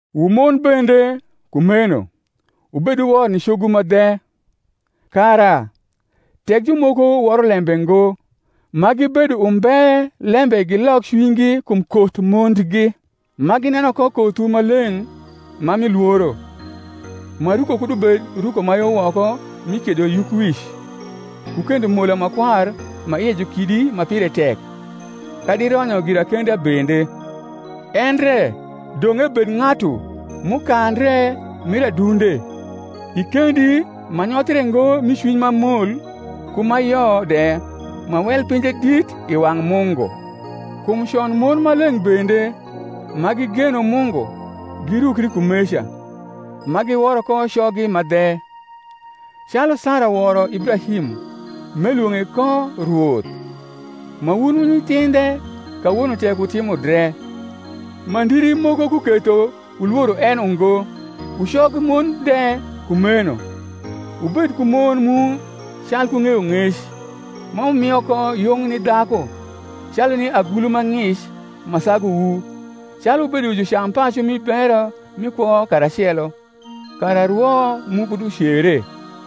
Wu mon bende, kumeno, wubed wor ni cogwu ma dhe; kara, tek jumoko woro lembe ngo, ma gibedo umbe lembe gilok cwinygi kum koth mondgi; ma gineno ko kothwu ma leng’ ma mi lworo. Ma ruko kud ubed ruko ma yo woko mi kiedo yukwic, ku kendo mola ma kwar ma ie ju kidi ma pire tek, kadi ronyo girakenda bende; endre dong’ ebed ng’atu m’ukandre mir adunde, i kendi ma nyothre ngo mi cwiny ma mol ku ma yo de, ma wel pinje dit i wang’ Mungu. Kum con mon ma leng’ bende, ma gigeno Mungu, girukri kumeca, ma giworo ko coggi ma dhe: calu Sara woro Ibrahim, m’elwong’e ko rwoth: ma wun wu nyithindhe kawono tek wutimo dre, ma ndiri moko kuketho wulworo en ungo. Wu cogmon de, kumeno, wubed ku mon mu calku ng’eyong’ec, ma wumio ko yung ni dhaku, calu ni agulu ma ng’ic ma sagu wu, calu wubedo jucampacu mi bero mi kwo karacelo; kara rwo mu kud ucere.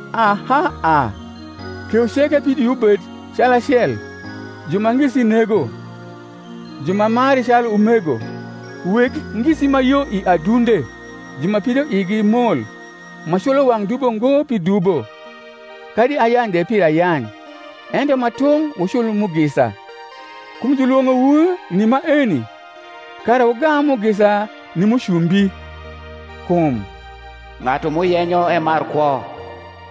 Aha a, kewu ceke pidoiwu bed calacel, ju ma ngisi nego, ju ma mari calu umego, weg ngisi ma yo i adunde, ju ma pidoigi mol: ma culo wang’ dubo ngo pi dubo, kadi ayany de pir ayany; ento ma tung’ wucul mugisa; kum jniwong’owu ni maeni, kara wugam mugisa ni mucumbi. Kum, Ng’atu m’uyenyo emar kwo,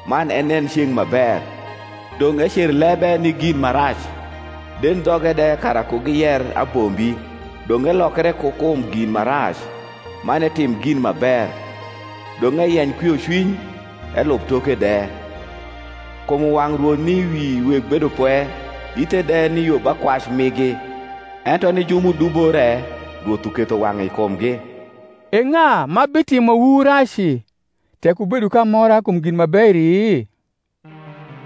Man enen ceng’ ma ber, Dong’ ecer lebe ni gin ma rac, Dendhoge de kara ku giyer abombi: Dong’ elokre ku kum gin ma rac, man etim gin ma ber; Dong’ eyeny kwiocwiny, elub toke de. Kum wang’ Rwoth ni wi weg bedopwe, Ithe de ni yo ba kwac migi: Ento ni ju m’udubo re Rwoth uketho wang’e i kumgi. E ng’a ma bitimowu raci, tek wubedo k’amora kum gin ma beri?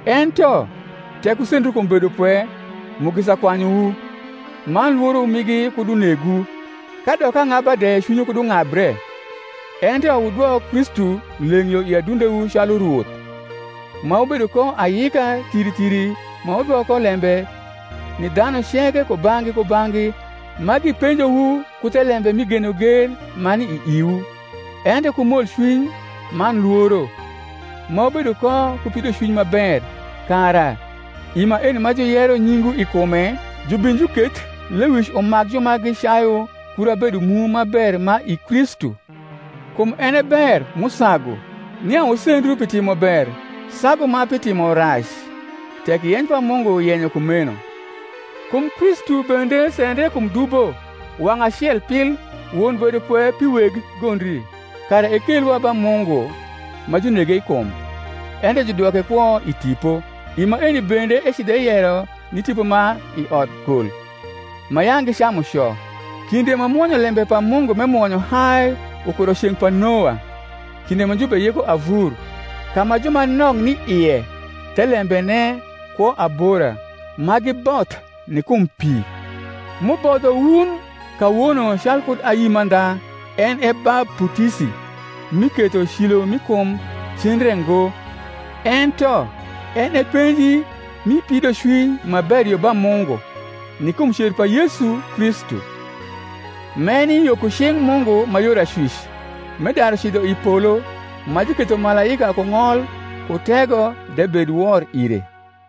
Ento tek wusendru kum bedopwe, mugisa kwanyuwu: man lworo migi kud unegwu, kadok ang’aba de cwinywu kud ung’abre; ento wudwok Kristu leng’ yo i adundewu calu Rwoth: ma wubedo ko ayika thiri thiri ma wudwok ko lembe ni dhanu ceke kubang’gi kubang’gi ma gipenjowu ku thelembe mi genogen ma ni i iwu, ento ku molcwiny man lworo: ma wubedo ko ku pidocwiny ma ber; kara, i maeni ma juyero nyingwu i kume, jubin juketh lewic umak ju ma gicayu kura bedo mu ma ber ma i Kristu. Kum en e ber m’usagu, nia wusendru pi timober sagu ma pi timorac, tek yeny pa Mungu yenyo kumeno. Kum Kristu bende sendre kum dubo wang’ acel pil, won bedopwe pi weg gondri, kara ekelwa ba Mungu; ma junege i kum, ento judwoke kwo i tipo; i maeni bende ecidho eyero ni tipo ma i odkol, ma yang’ gicamu co, kinde ma mwonyolembe pa Mungu m’emwonyo hai ukuro i ceng’ pa Noa, kinde ma jubeyiko avur, ka ma ju ma nok ni ie, thelembene, kwo abora, ma giboth ni kum pi: m’ubodho wun kawono calkud ayi mandha, en e baputisi, m’iketho cilo m’i kum cen re ngo, ento en e penji mi pidocwiny ma ber yo ba Mungu, ni kum cer pa Yesu Kristu; m’eni yo ku cing’ Mungu ma yor acwic, m’edaru cidho i polo; ma juketho malaika ku ng’ol ku tego de bed wor ire.